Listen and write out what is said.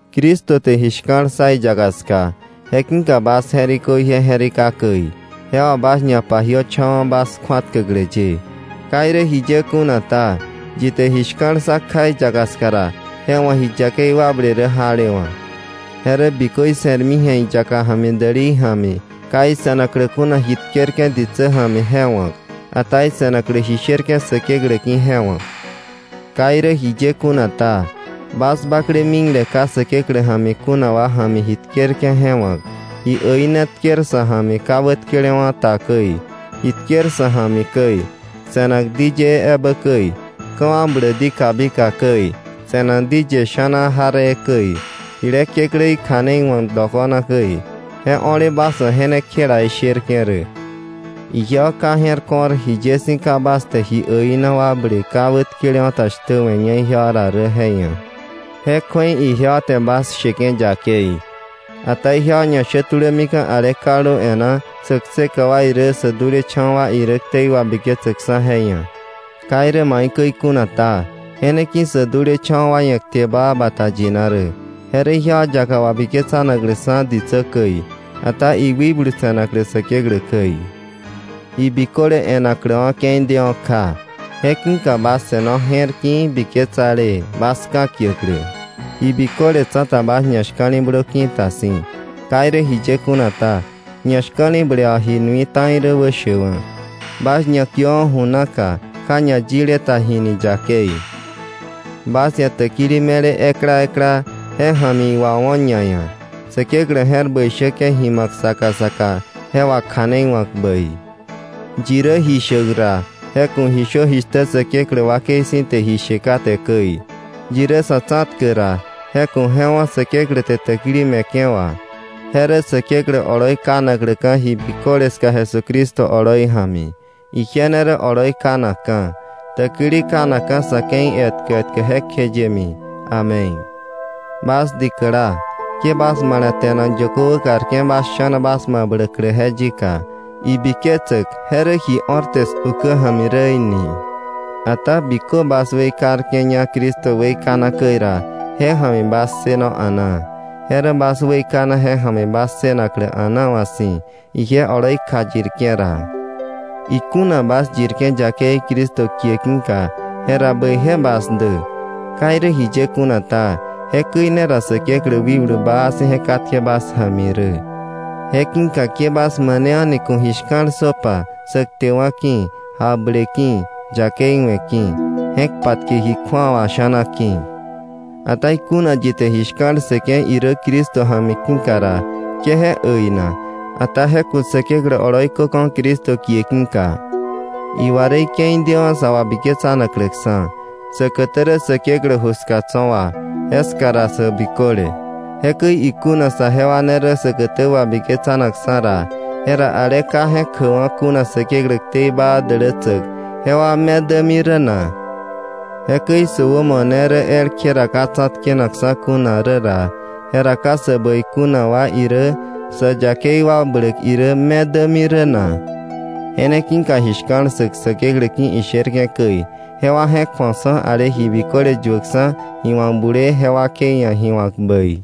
Cristo te ji shka̱l ssa iyaka ska, je ki̱ka bas je̱rikö ije je̱rika käi, je wà bas ñapajiöcho̱wa̱ bas kju̱atkäklä ye. Ka irä jiye kuna ta, yi te ji shka̱l ssa kja iyaka ska ra, je wa̱ ji yakei wakble rä jalewa̱, je rä bikö ise̱rmi ji̱a iyaka ja̱mi dälei ja̱mi, ka ise̱naklä kuna ji tkerke̱ ditsä ja̱mi je wa̱k, ata ise̱naklä ji sherke̱ Säkeklä ki̱ je wa̱k. Ka irä jiye kuna ta, bas bakle mikle, ka Säkeklä ja̱mi kuna wa ja̱mi ji tkerke̱ je wa̱k, ji äina tker sa̱ ja̱mi ka wätkelewa̱ ta käi, ji tker sa̱ ja̱mi käi, se̱nak diyëë ebä käi, ka̱wakbläk di kabika käi, se̱nak di ye sha̱na jaree käi, jile kekläí kja̱nei wa̱k dokona käi, je o̱le bas wa̱ je ne kjela isherke̱ rä. Ijewa ka je̱r ko̱r, jiye si̱ ka bas te ji äina wakble ka wätkele ta shtä we̱ña ijewa ra rä je ia̱. Je kju̱ei ijewa te bas sheke̱ yakei. Ata ijewa ñashä tulämika̱ ale kaldu e̱ná, sä kseka wa irä sä dulecha̱wa̱ wa irä ktei wabiketsäkksa̱ je ia̱. Ka irä maikäi kuna ta, je ne ki̱ sä dulecha̱wa̱ wa ia̱ kte baa bata yina rä, je rä ijewa yaka wabiketsanakläksa̱ ditsä käi, ata iwikblu se̱naklä Säkeklä käi. Ji biköle e̱nakläwa̱ ke̱i dewa̱ kja, je ki̱ka bas se̱no je̱rki̱i̱ biketsalee, bas ka̱kiäklä. Ji biköle tsa̱ta bas ñashka̱li̱blö ki̱ta si̱. Ka irä jiye kuna ta, ñashka̱li̱ble wà ji nui ta̱i rä wäshäkwa̱. Bas ñakiöwa̱ ju naka ka ñayile ta jini yakei. Bas ia̱ täkili me̱le ekla ekla, je ja̱mi iwawo̱ ñaia̱, Säkeklä je̱r bäi shäke̱ ji ma̱k saka saka je wakja̱neiwa̱k bäi. Yi rä ji shäk ra, je ku̱ ji shö jishtä Säkeklä wakei si̱ te ji she kate käi. Yi rä sa̱ tsa̱tkäk ra, je ku̱ je wo̱ Säkeklä te täkili me̱ke̱ wà. Je rä Säkeklä oloi kanakläka̱ ji biköle ska Jesucristo oloi ja̱mi; ije ne rä oloi kanakka̱, täkili kanakka̱ sa̱ ke̱i etkä etkä jekjeyemi. Amén. Bas dikäla, ke bas male̱te̱nak yökö wäkarke̱ bas sha̱na bas mabläklä je yika, ibiketsäk je rä ji o̱rte 's ukä ja̱mi rä í̱ ni. Ata bikö bas weikarke̱ña Cristo weikana käi ra, je ja̱mi bas ssëno a̱naa. Je rä bas weikana je ja̱mi bas ssënaklä a̱naawa̱ si̱, ije oloi kjayirke̱ ra. Ikuna bas yirke̱ yakei Cristo kie ki̱ka, jera bäije bas dä. Ka irä jiye kuna ta, jekäi ne ra Säkeklä wikblu baa si̱ je katke bas ja̱mi rä. Je ki̱ka ke bas mane a̱ni ku̱ ji shka̱l ssöpa sä ktewa̱ ki̱, jakble ki̱, yakei we̱ ki̱, je̱k patke ji kju̱awa sha̱na ki̱. Ata ikuna yi te ji shka̱l ssëke̱ irä Cristo ja̱mi ki̱ ra, ke je äina, ata je ku̱ Säkeklä oloi köka̱, Cristo kie ki̱ka. Iwa rä ike̱i dewa̱ sa wabiketsanakläksa̱. Säkätä rä Säkeklä ju ska tso̱ wa, jeska ra sä biköle. Jekäi ikuna saje wa ne rä säkätä wabiketsanakksa̱ ra, ¿jera ale ka je̱k jäkwa̱ kuna Säkeklä ktei baa dälätsäk, jewa me dämi rä na? “Jekäi ikuna sä wämo ne rä elkje ra ka tsa̱tkenakksa̱ kuna rä ra, ¿jera ka sä bäi kuna wa irä, sä yakei wakbläk irä, me dämi rä na?” Je ne ki̱ka ji shka̱l ssäk Säkeklä ki̱ isherke̱ käi, jewa je̱k ju̱oksa̱ ale ji biköle yuäkksa̱, ji wa̱k bulee, je wakei ia̱ ji wa̱k bäi.